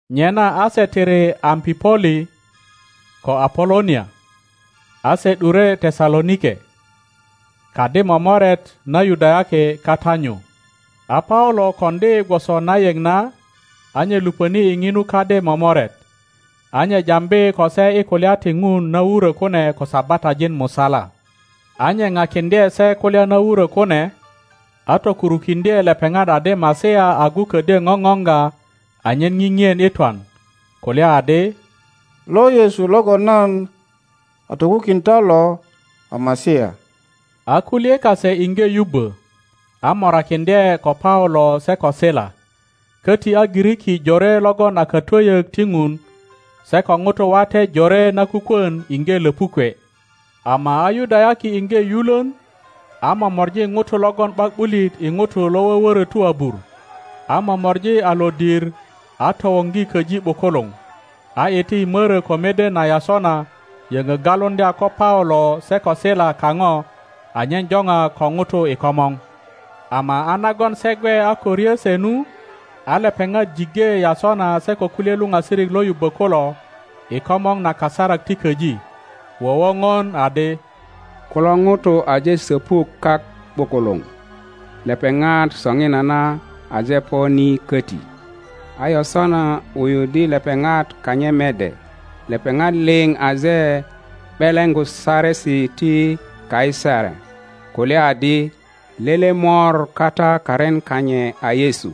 Nyena a se tiri Ampipoli ko Apolonia, a se ’dure Tesalonike. Kadi momoret na Yudayaki kata nyu. A Paulo koŋdi gwoso na yeŋ na, a nye luŋöni i omu kadi momoret, a nye jambi ko se i kulya ti Ŋun na wurö kune ko Sabatajin musala. a nye Pakiŋdye se kulya na wurö kune, a tokurukiŋdye lepeŋat adi Masia agu ködyo ŋoŋoŋga anyen ŋiŋien i twan, kulya adi, Lo Yesu logon nan a tokukin ta lo a Masia. a kulye kase iŋge yubbö, a morakiŋdye ko Paulo se ko Sila, köti a Giriki jore logon a katwöyök ti Ŋun, se ko ŋutu wate jore na kukwön iŋge löpukwe. Ama a Yudayaki iŋge yulön, a momori ŋutu logon ’bak ’bulit i ŋutu lo wöwörötu abur, a momori a lodir a towoŋgi köji ’bukuluŋ, a iti i mörö ko mede na Yasona yöŋö galuŋdya ko Paulo se ko Sila kaŋo anyen joŋa ko ŋutu i komor. Ama a nagon se gwe a ko ryö se nu, a lepeŋat jiŋge Yasona se ko kulye luoasirik lo yubbö kulo i komŋo na kasarak ti köji, wowoŋon adi, Kulo ŋutu aje söpuk kak ’bukuluŋ! Lepeŋat soŋinana aje po ni köti, a Yasona wuyuddi lepeŋat kanyit mede. Lepeŋat liŋ aje ’beleŋgu saresi ti Kaisar kulya adi, Lele mor kata karin kanyit a Yesu.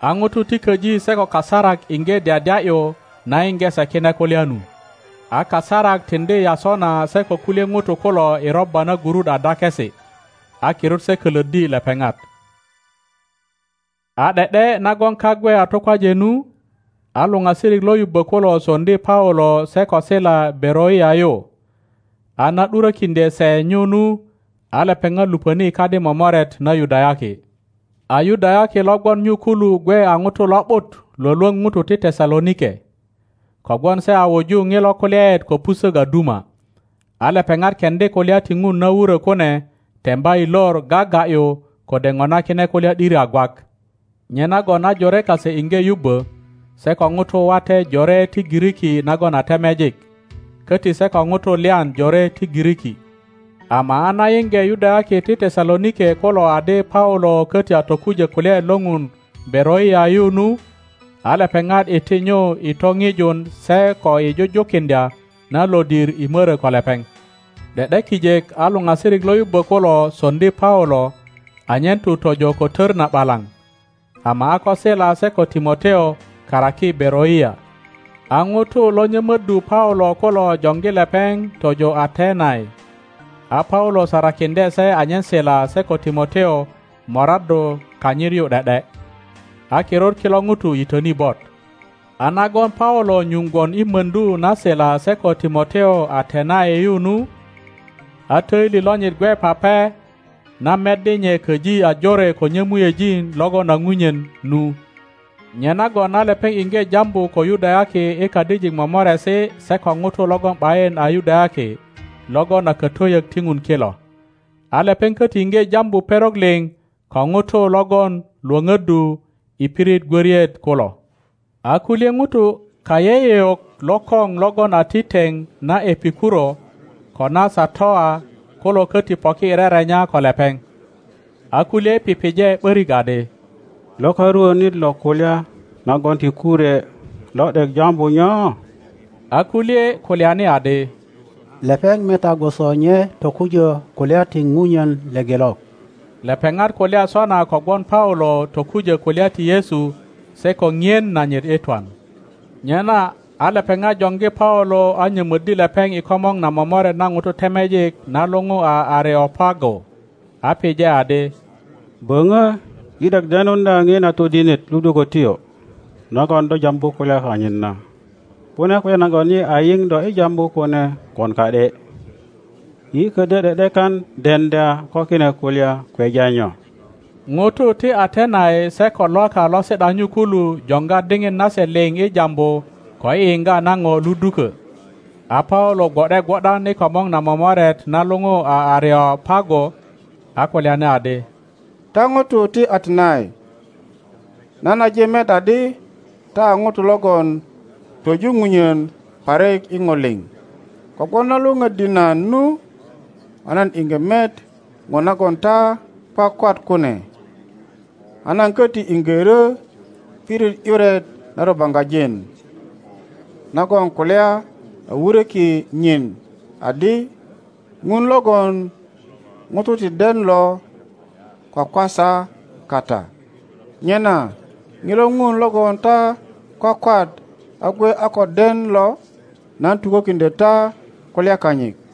A ŋutu ti köji se ko kasarak iŋge dyadya ’yu na yiŋge se kine kulya nu. A kasarak tiŋdi Yasona se ko kulye ŋutu kulo i robba na gurut a dakesi, a kirut se kölöddi lepeŋat. A ’de ’de nagon kak gwe a tukwaje nu, a luŋasirik lo yubbo kulo soŋdi Paulo se ko Sila Beroia yu, a na ’durökiŋdye se nyu nu, a lepeŋat luŋöni i kadi momoret na Yudayaki. A Yudayaki lo gwon nyu kulu gwe a ŋutu lo ’but lwölwöŋ ŋutu ti Tesalonike, kogwon se a wuju ŋilo kulyaet ko pusök a duma, a lepeŋat keŋdi kulya ti Ŋun na wurö kune temba i lor gaga ’yu kode ŋona kine kulya ’diri a gwak. Nyenagon a jore kase iŋge yubbö se ko ŋutu wate jore ti Giriki nagon a temejik, köti se ko ŋutu lyan jore ti Giriki. Ama a na yiŋge Yudayaki ti Tesalonike kulo adi Paulo köti a tokujö kulyaet lo Ŋun Beroia yu nu, a lepeŋat iti nyu i topiju se ko i jujukindya na lodir i mörö ko lepeŋ. ’De ’de kijek a luŋasirik lo yubbö kulo sondi Paulo anyen tu tojo ko tör na ’balaŋ, ama a ko Sila se ko Timoteo karaki Beroia. a ŋutu lo nyömöddu Paulo kulo joŋgi lepeŋ tojo Atenai, a Paulo sarakindye se anyen Sila se ko Timoteo moraddu kanyit yu ’de ’de. A kirut kilo ŋutu yitöni bot. A nagon Paulo nyuŋ gwon i möndu na Sila se ko Timoteo Atenai yu nu, a töili lonyit gwe pape na meddi nye köji a jore ko nyömuejin logon a punyen nu. Nyenagon a lepeŋ iŋge jambu ko Yudayaki i kadijik momoresi se ko ŋutu logon ’bayin a Yudayaki logon a katwöyök ti Ŋun kilo. A lepeŋ köti iŋge jambu perok liŋ ko ŋutu logon lwöpöddu i pirit gwöriet kulo. A kulye ŋutu kayeyeŋ lokoŋ logon a ti teŋ na Epikuro Epikuro…Satoa Ga ’yi tokeresi kase i kidiŋ na buk i pirit na luŋu a Denesi ko na Satoa kulo köti poki i rerenya ko lepeŋ. A kulye pipije ’borik adi, Lo karuonit lo kulya nagon ti kurwe lo ’dek jambu nyo? A kulye kulyani adi, Lepeŋ meta gwoso nye tokujö kulya ti punyen lepelok. Lepeŋat kulya sona kogwon Paulo tokujö kulya ti Yesu se ko ŋien nanyit i twan. Nyena a lepeŋat joŋgi Paulo a nyömöddi lepeŋ i komor na momoret na ŋutu temejik na luŋu a Areopago, a pije adi, Böŋö yi ’dek denuŋdya ŋina todinet ludukötyo nagon do jambu kulya kanyit na. Kune kulya nagon yi a yiŋ do i jambu kune gwon ka ’de; yi ködyö ’de ’dekan deŋdya ko kine kulya kweja nyo. (Ŋutu ti Atenai se ko Lwaka lo si ’da nyu kulu joŋga diŋit nase liŋ i jambu ko i yiŋga na ŋo luduko.) A Paulo gwo ’de gwo ’dan i komor na momoret na luŋu a Areopago, a kulyani adi, Ta ŋutu ti Atenai, nan aje met adi ta a ŋutu logon twöju ŋunyen parik i ŋo liŋ. Kogwon na lwöŋöddi nan nu a nan iŋge met ŋo nagon ta kwakwat kune, a nan köti iŋge ryö pirit ’yuret na rubaŋgajin nagon kulya a wuröki nyin adi, Ŋun logon ŋutu ti den lo kwakwasa kata. Nyena ŋilo Ŋun logon ta kwakwat a gwe a ko den lo, nan tukökiŋdyö ta kulya kanyit.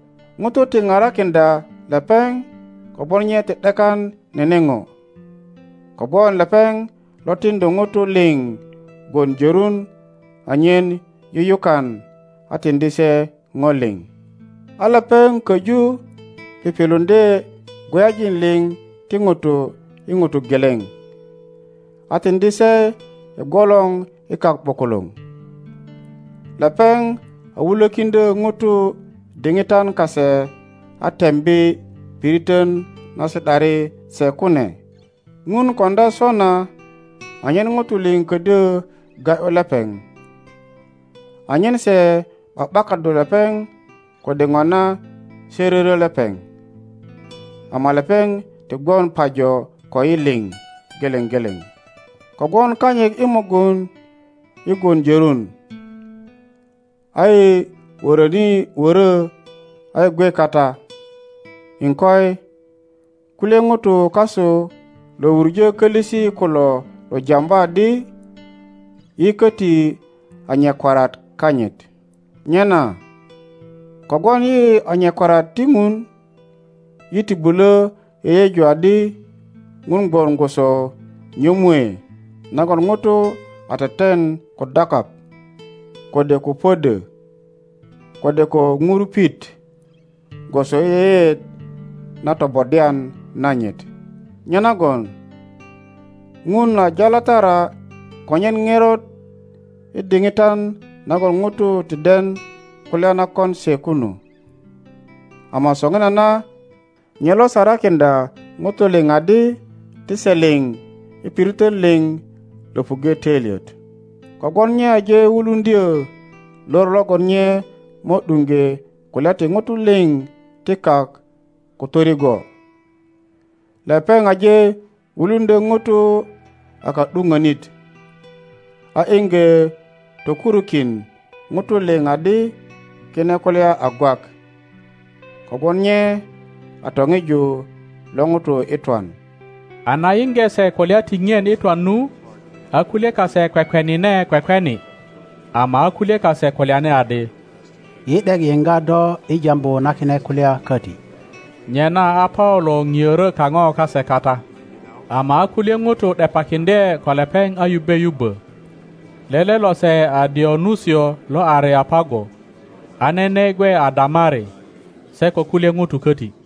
Ŋutu ti parakiŋdya lepeŋ kogwon nye ti ’dekan nene ŋo, kogwon lepeŋ lo tiŋdu ŋutu liŋ gwon jörun anyen yuyukan, a tiŋdi se ŋo liŋ. A lepeŋ köju piŋiluŋdye gweyajin liŋ ti ŋutu i ŋuto geleŋ, a tiŋdi se i gwolor i kak ’bukuluŋ. Lepeŋ a wulökiŋdyö ŋutu diŋitan kase a tembi piritön na si ’dari se kune. ŋun koŋdya sona anyen ŋutu liŋ ködyö ga ’yu lepeŋ, anyen se ’ba ’bakaddu lepeŋ kode ŋona se ryöryö lepeŋ. Ama lepeŋ ti gwon pajo koyi liŋ geleŋ geleŋ. Kogwon kanyit i mugun yi gwon jörun, a yi wöröni wörö a yi gwe kata. Iŋkoi, kulye ŋutu kasu lo wuŋö kölisi kulo lo jambu adi, Yi köti a nyakwariat kanyit. Nyena kogwon yi a nyakwariat ti Ŋun, yi ti bulö yeyeju adi Ŋun gwon gwoso nyömue nagon ŋuto a teten ko dakaŋ, kode ko pödö, kode ko ŋurupit, gwoso i yeyeet na tobodwan nanyit. Nyenagon Ŋun a jalatara konyen ŋerot i diŋitan nagon ŋutu ti den kulya na kon se kunu, ama soŋinana nye lo sarakiŋdya ŋutu liŋ adi ti se liŋ i piritön liŋ löpuŋge töilyet; kogwon nye aje wuluŋdyö lor logon nye mo ’duŋge kulya ti ŋutu liŋ ti kak ko torigwo. Lepeŋ aje wuluŋdyö ŋuto a ka ’duŋönit, a iŋge tokurukin ŋutu liŋ adi kine kulya a gwak, kogwon nye a toŋiju lo ŋuto i twan. A na yiŋge se kulya ti ŋien i twan nu, a kulye kase kwekwenine kwekweni, ama a kulye kase kulyani adi, Yi ’dek yiŋga do i jambu na kine kulya köti. Nyena a Paulo ŋiörö kaŋo kase kata. Ama a kulye ŋutu ’depakiŋdye ko lepeŋ a yubbe yubbö. Lele lose a Dionusio lo Areopago, a nene gwe a Damari, se ko kulye ŋutu köti.